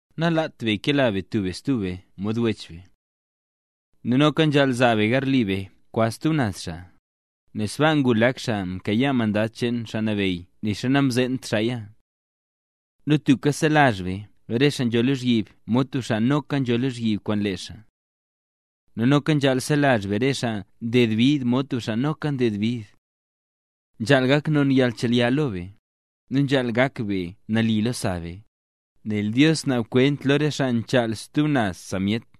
Nalaat be kela be tub be stub be mod wech be. Nu noka nzhaal zaa be garli be kwaz stub naz xaa, nel sbaa ngu lak xaa mkayaa mandad cheen Xaa Nabeyy nixa namzeent xaaya. Nu tubka selazh be re xaa nzho lozhyib mod tub xaa noka nzho lozhyib kwaan lee xaa. Nu noka nzhaal selazh be re xaa nded bid mod tub xaa noka kaded bid. Nzhaal gak non yalnchelya lo be, nu nzhaal gak be nali lo sa be, nel Dios naab kwent lo re xaa nchaal stub naz sa myet.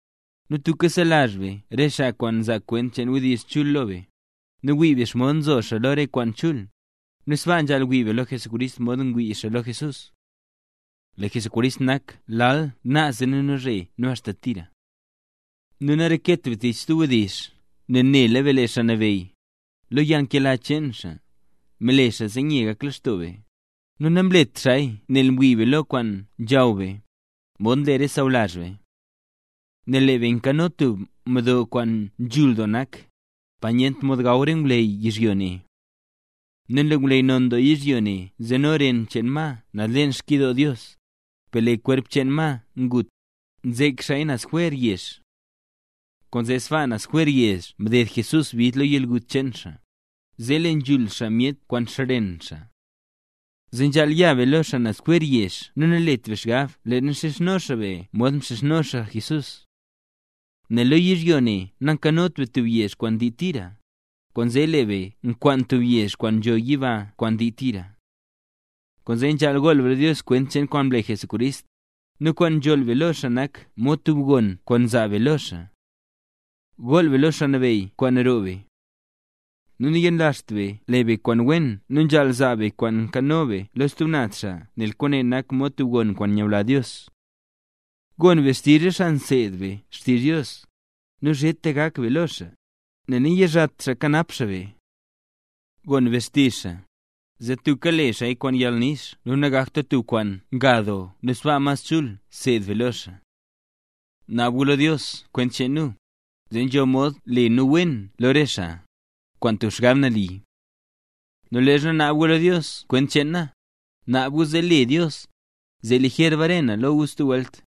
Nu tubka selazh be re xaa kwaan nzaa kwent cheen wdizh chul lo be, nu wii be xomod nzo xaa lo re kwaan chul, nu sbaaka nzhaal wii be lo Jesús modxa ngwii xaa lo Jesús. Lee Jesucrist nak lal naaze nu nalzhe nu axta tira. Nu nareket be tich stub wdizh, nel nela be lee Xaa Nabeyy, lo yalnkela cheen xaa, mle xaa zee nye gak lextoo be, nu namlet xaaya nel ngwii be lo kwaan nzhaw be, mod nle re xaa sawlazh be. Nel lee be nkano tub mdo kwaan nzhul doo nak, pa nyent mod gaw re ngwleyy yizhyo ne. Nu lee ngwleyy non doo yizhyo ne nzeno ren cheen ma naz leen xkyidoo Dios, per lee kwerp cheen ma ngut, nzek xaaya naz jwer yezh. Kwaanzee sbaaka naz jwer yezh mded Jesús bid lo yalgut cheen xaa, zee le nzhul xaa myet kwaan xren xaa. Zee nzhaal ya be lo xaa naz jwer yezh nu nalet be xgab leezha xizhno xaa be mod mxizhno xaa Jesús. Nel lo yizhyo ne nankanot be tub yezh kwaan ndii tira, kwaanzee lee be nkwaan tub yezh kwaan nzho yiba kwaan ndii tira. Kwaanzee nzhaal gool be lo Dios kwent cheen kwaan mle Jesucrist, nu kwaan nzholl be lo xaa nak mod tub gon kwaan nzaa be lo xaa. Gool be lo Xaa Nabeyy kwaan roo be. Nu nayenlazht be le be kwaan wen nu nzhaal zaa be kwaan nkano be lo stub naz xaa nel kwaane nak mod tub gon kwaan nyula Dios. Gon be xtizh re xaa nseed be xtizh Dios, nu zheta gak be lo xaa, nel nanyizhat xaa kanap xaa be. Gon be xtizh xaa, zee tubka le xaaya kwaan yalnix nu nagakta tub kwaan nga doo nu sbaa mas chul seed be lo xaa. Naab gu lo Dios kwent cheen nu, zee nzho mod le nu wen lo rese xaa, kwaan tub xgab nali. Nu leezha naab gu lo Dios kwent cheen na, naab gu zee le Dios, zee lijer bare na lo gu stub welt.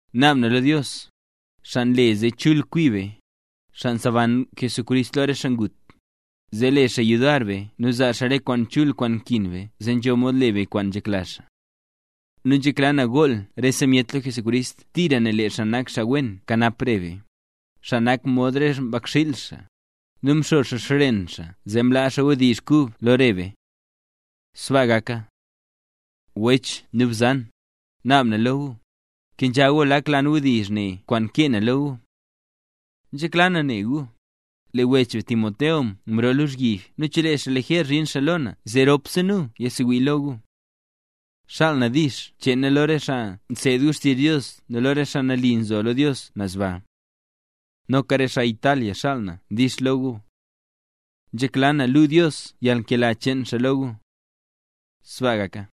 Naab na lo Dios, xaa nle zee chul kwi be, xaa mseban Jesucrist lo re xaa ngut, zee le xaa yudar be nu zaa xaa rese kwaan chul kwaan nkin be zee nzho mod le be kwaan nzhekla xaa. Nu nzhekla na gool rese myet lo Jesucrist tira nel lee xaa nak xaa wen nkanap re be, xaa nak mod re xmbakxiil xaa, nu mxo xaa xren xaa zee mlaa xaa wdizh kub lo re be. ¡Sbaa gaka! Wech nu bzan, naab na lo gu, nkenzha gu lak lan wdizh ne kwaan mkee na lo gu. Nzhekla na ne gu, lee wech be Timoteo mroola lozhyib nu chelee xaa lijer zhin xaa lo na zee ropse nu yasewii lo gu. Xaal na “dix” cheen na lo re xaa nseed gu xtizh Dios nu lo re xaa Jesús, xaa nambey naz baa. Noka re xaa Italia xaal “dix” lo gu. Nzhekla na luu Dios yalnkela cheen xaa lo gu. Sbaa gaka.